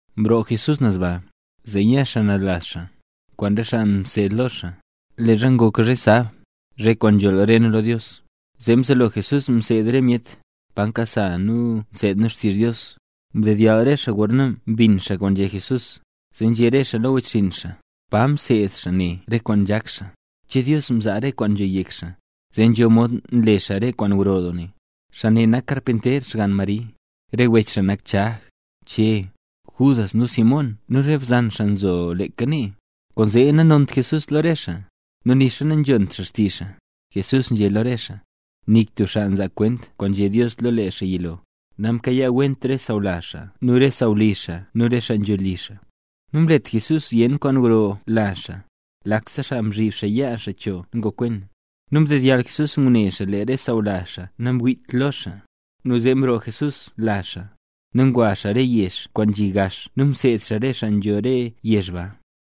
Mroo Jesús naz ba, zee nya xaa naz lazh xaa, kwaan re xaa mseed lo xaa. Leezha ngok zhe sab, zhe kwaan nzholl re nu lo Dios, zee mzelo Jesús mseed re myet, pa nkasa nu nseed nu xtizh Dios. Mdedyall re xaa gorna mbin xaa kwaan nzhé Jesús. Zee nzhé re xaa lo wechxinn xaa: —¿Pa mseed xaa ne re kwaan nzhak xaa? ¿Che Dios mzaa rese kwaan nzho yek xaa, zee nzho mod nle xaa re kwaan gro doo ne? ¡Xaa ne nak karpinter xgann Mari! ¡Re wech xaa nak Chag, Che, Judas nu Simón nu re bzan xaa nzho leeka nee! Kwaanzee nanont Jesús lo re xaa, nu nixa nanzhont xaa xtizh xaa. Jesús nzhé lo re xaa: —Nik tub xaa nzaa kwent kwaan nzhé Dios lo lee xaa yilo, namkayaawent re sawlazh xaa xaa nu re sawlizh xaa nu re xaa nzho li xaa. Namlet Jesús zyen kwaan gro lazh xaa, lakse xaa mzhib xaa yaa xaa cho nu ngokwen. Nu ndedyall Jesús ngune xaa lee re sawlazh xaa nangwiit lo xaa. Nu zee mroo Jesús lazh xaa, nu ngwa xaa re yezh kwaan nzhi gax nu mseed xaa re xaa nzho re yezh ba.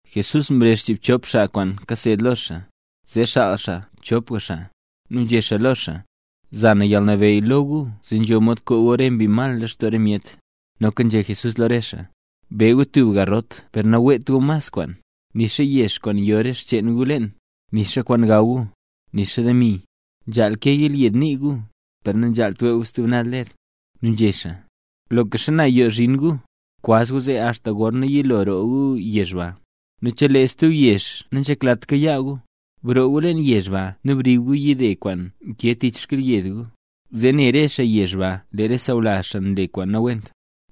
Jesús mrezh chiibchop xaa kwaan mseed lo xaa, zee xaal xaa chopga xaa, nu nzhé xaa lo xaa: —Za na yalnabeyy lo gu zee nzho mod koo gu rese mbi mal lextoo re myet. Noka nzhé Jesús lo re xaa: —Be gu tub garrot per naweet gu mas kwaan, nixa yex kwaan yo re xcheen gu leen, nixa kwaan gaw gu, nixa demi. Nzhaal ke yelyed nii gu, per nanzhaalt wee gu stub naz ler. Nu nzhé xaa: —Loka xana yoo zhin gu, kwaz gu zee axta gorna yilo roo gu yezh ba. Nu chelee tub yezh nanzheklat kayaa gu, broo gu leen yezh ba nu brib gu yide kwaan nkee tich xkyelyed gu, zee ne re xaa yezh ba lee re sawlazh xaa mle kwaan nawent.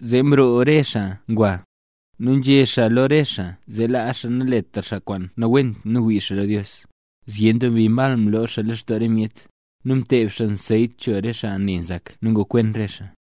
Zee mroo re xaa ngwa, nu nzhé xaa lo re xaa zee laa xaa naletra xaa kwaan nawent nu wii xaa lo Dios. Zyen doo mbi mal mloo xaa lextoo re myet, nu mteeb xaa anseyt cho re xaa ne nzak nu ngokwen re xaa.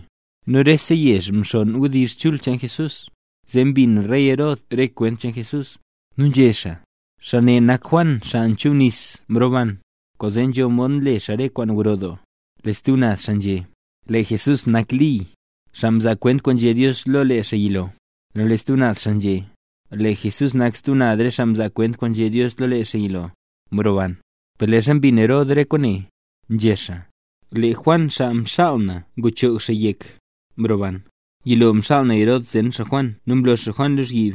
Nu rese yezh mxonn wdizh cheen Jesús, zee mbin rey Herod re kwent cheen Jesús, nu nzhé xaa: —Xaa ne nak Juan Xaa Nchubnis mroban, kwaanzee nzho mod nle xaa re kwaan gro doo. Lee stub naz xaa nzhé: —Lee Jesús nak Li, xaa mzaa kwent kwaan nzhé Dios lo lee xaa yilo. Nu lee stub naz xaa nzhé: —Lee Jesús nak stub re xaa mzaa kwent kwaan nzhé Dios lo lee xaa yilo, mroban. Per leezha mbin Herod re kwaane, nzhé xaa: —¡Lee Juan xaa mxaal na nguchoog xaa yek, mroban! Yilo mxaal Herod zen xaa Juan nu mlo xaa Juan lozhyib,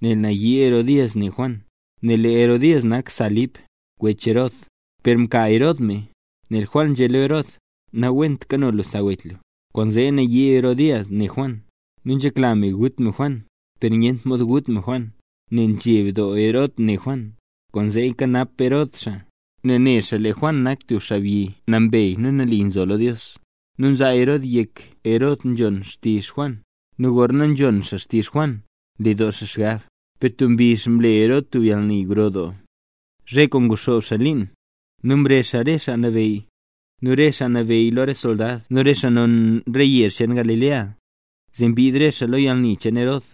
nel nayii Herodías ne Juan, nel lee Herodías nak sa Lip, wech Herod, per mka Herod me. Nel Juan nzhé lo Herod: —Nawent nkano lu sa wech lu. Kwaanzee nayii doo Herodías ne Juan, nu nzhekla me gut me Juan, per nyent mod gut me Juan, nel nzheb doo Herod ne Juan. Kwaanzee nkanap Herod xaa, nel ne xaa lee Juan nak tub xaabyi nambey nu nali nzo lo Dios. Nu nzaa Herod yek Herod nzhon xtizh Juan, nu gorna nzhon xaa xtizh Juan, nle doo xaa xgab. Per tub mbizh mle Herod tub yalni gro doo, zhe kwaan nguxoob xaa liin. Nu mrezh xaa rese xaa nabeyy, nu rese xaa nabeyy lo re soldad nu rese xaa non re yezh cheen Galilea, zee mbid re xaa lo yalni cheen Herod.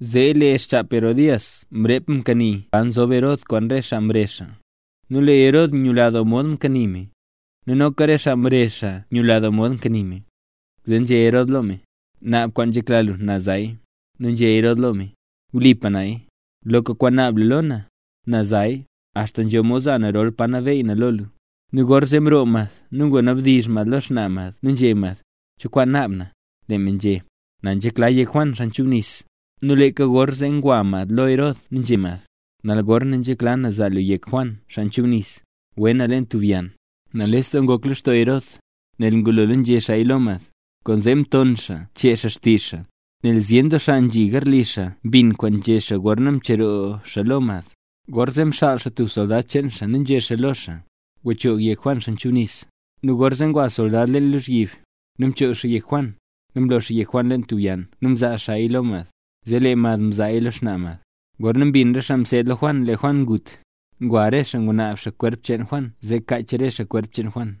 Zee lee xchap Herodías mrep mkanii paro mzob Herod kwaan re xaa mrezh xaa. Nu lee Herod nyula doo mod mkanii me, nu noka re xaa mrezh xaa nyula mod mkanii me, zee nzhé Herod lo me: —Naab kwaan nzhekla lu, na zaya. Nu nzhé Herod lo me: —Wlipa naya, loka kwaan naab lu lo na, za naya, axta nzho mod za na rol pa nabeey na lo lu. Nu gorzee mroo mad nu ngwanabdizh mad lo xnaa mad nu nzhé mad: —¿Cho kwaan naab na? Lee me nzhé: —Na nzhekla yek Juan Xaa Nchubnis. Nu leeka gorzee ngwa mad lo Herod nu nzhé mad: —¡Nal gorne nzhekla na zaa lu yek Juan Xaa Nchubnis, we na leen tub yann! Nales doo ngok lextoo Herod, nel ngulola nzhé xaaya lo mad. Kwaanzee mton xaa chee xaa xtizh xaa, nel zyen doo xaa nzhi garli xaa mbin kwaan nzhé xaa gorna mcheroo lo mad. Gorzee mxaal xaa tub soldad cheen xaa, nu nzhé xaa lo xaa: —Gwachoog yek Juan Xaa Nchubnis. Nu gorzee ngwa soldad leen lozhyib, nu mchoog xaa yek Juan. Nu mlo xaa yek Juan leen tub yann nu mzaa xaaya lo mad, zee lee mad mzaaya lo xnaa mad. Gorna mbin re xaa mseed lo Juan lee Juan ngut, ngwa re xaa ngunaab xaa kwerp cheen Juan zee kaach re xaa kwerp cheen Juan.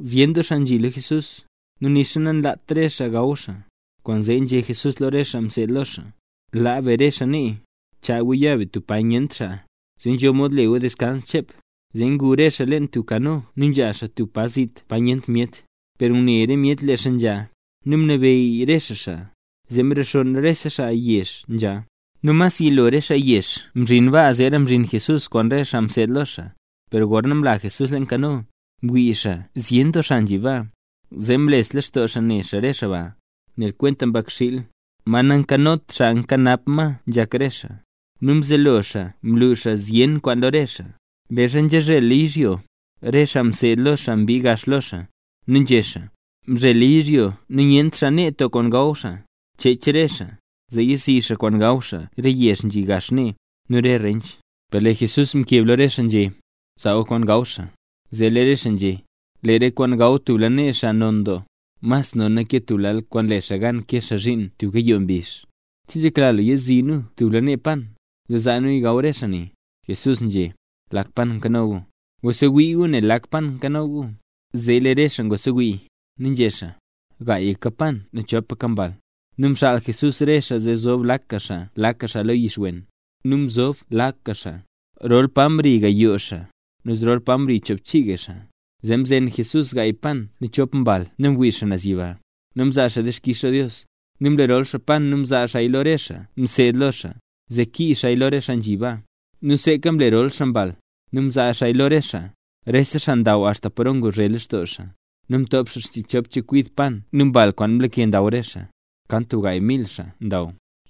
Zyen doo xaa nzhi lo Jesús, nu nixa nanlat re xaa gaw xaa, kwaanzee nzhé Jesús lo re xaa mseed lo xaa: —Laa be re xaa nee. Chaa gu ya be tub pa nyent xaa, zee nzho mod le gu deskans chep. Zee ngu re xaa leen tub kano nu nzha xaa tub pa zit, pa nyent myet. Per ngune re myet lee xaa nzha, nu mlebeyy re xaa xaa, zee mrexonn rese xaa yezh nzha. Nu mas yilo re xaa yezh mzhin baa zeera mzhin Jesús kwaan re xaa mseed lo Jesús. Per gorna mla Jesús leen kano, mwii xaa zyen doo xaa nzhi baa. Zee mles lextoo xaa ne xaa re xaa ba, nel kwenta mbakxiil, ma nakanot xaa kanap ma nzhak re xaa. Nu mzelo xaa mlu xaa zyen kwaan lo re xaa. Leezha nzhazhela yizhyo, re xaa mseed lo xaa mbii gax lo xaa, nu nzhé xaa: —Mzhela yizhyo nu nyent xaa nee to kwaan gaw xaa. Chech re xaa, zee yizi xaa kwaan gaw xaa re yezh nzhi gax nee, nu re rench. Per lee Jesús mkeb lo re xaa nzhé: —Zaa gu kwaan gaw xaa. Zee lee re xaa nzhé: —Lee re kwaan gaw tub lanee xaa non doo. Mas nona ke tub lal kwaan le xaa gan kee xaa zhiin tub gayoo mbizh. ¿Che nzhekla lu yazii nu tub lanee pan, zee zaa nuya gaw re xaa ne? Jesús nzhé: —¿Lak pan nkano gu? Gwasewii gu ne lak pan nkano gu. Zee lee re xaa ngwasewii, nu nzhé xaa: —Gaayka pan nu chopaka mbal. Nu mxaal Jesús re xaa zee zob lakga xaa lakga xaa lo yix wen. Nu mzob lakga xaa. Rol pa mri gayooga xaa, nu zrol pa mri choobchiiga xaa. Zee mzen Jesús gaay pan nu rop mbal nu mwii xaa naz yiba, nu mzaa xaa dixkix lo Dios. Nu mlerol xaa pan nu mzaa xaaya lo re xaa mseed lo xaa, zee kiiz xaaya lo re xaa nzhi baa. Nu seeka mlerol xaa mbal, nu mzaa xaa ma lo re xaa. Rese xaa ndaw axta paro nguzhe lextoo xaa. Nu mtop xaa zchiibchop chekwid pan nu mbal kwaan mlake ndaw re xaa. Kan tub gaay mil xaabyi ndaw.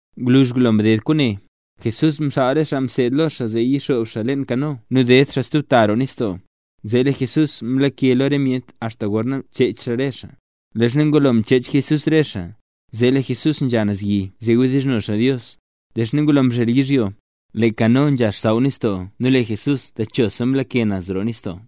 Gwluzh ngulo mded kwaane, Jesús mxaal re xaa mseed lo xaa zee yixoob xaa leen kano nu ded xaa stub ta roo nistoo lo yezh Betsaida. Zee lee Jesús mlake lo re myet axta gorna chech xaa re xaa. Leezha ngulo mchech Jesús re xaa, zee lee Jesús nzha naz yi zee wdizhno xaa Dios. Leezha ngulo mzhel yizhyo, lee kano nzha xsaww nistoo nu lee Jesús techosa mlake naz roo nistoo.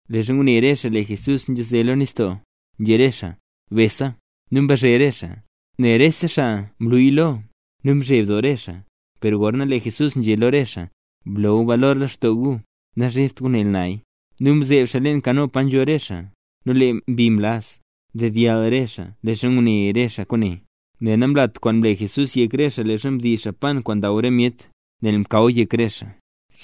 Leezha ngune re xaa lee Jesús nzhaze lo nistoo, nzhé re xaa: —¡Besa! Nu mbazhe re xaa, nel rese xaa mluya lo, nu mzheb doo re xaa. Per gorzee lee Jesús nzhé lo re xaa: —Blo gu balor lextoo gu, nazhebt gu, nel naya. Nu mzeeb xaa leen kano pa nzho re xaa, nu lee mbi mlaz. Ndedyall re xaa leezha ngune re xaa kwaane. Nel namlat kwaan mle Jesús yek re xaa leezha mdiiz xaa pan kwaan ndaw re myet, nel mkaw yek re xaa.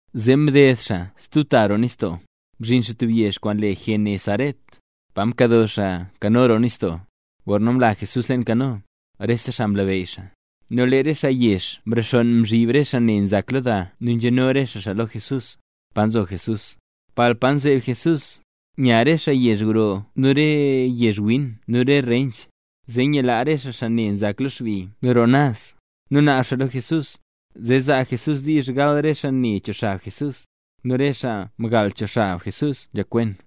Zee mded xaa stub ta roo nistoo, mzhin xaa tub yezh kwaan le Genesaret, pa mkado xaa kano roo nistoo. Gorna mla Jesús leen kano, rese xaa mlabeyy xaa. Nu lee re xaa yezh mrexonn mzhib re xaa ne nzak lo da nu nzheno re xaa xaa lo Jesús, pa nzo Jesús. Palpa nzeeb Jesús, nya xaa re yezh gro nu re yezh win nu re rench, zee nyilaa re xaa re xaa ne nzak lo xbi nu roo naz. Nu naab xaa lo Jesús, zee zaa Jesús diizh gal re xaa ne cho xab Jesús, nu re xaa mgal cho xab Jesús nzhakwen.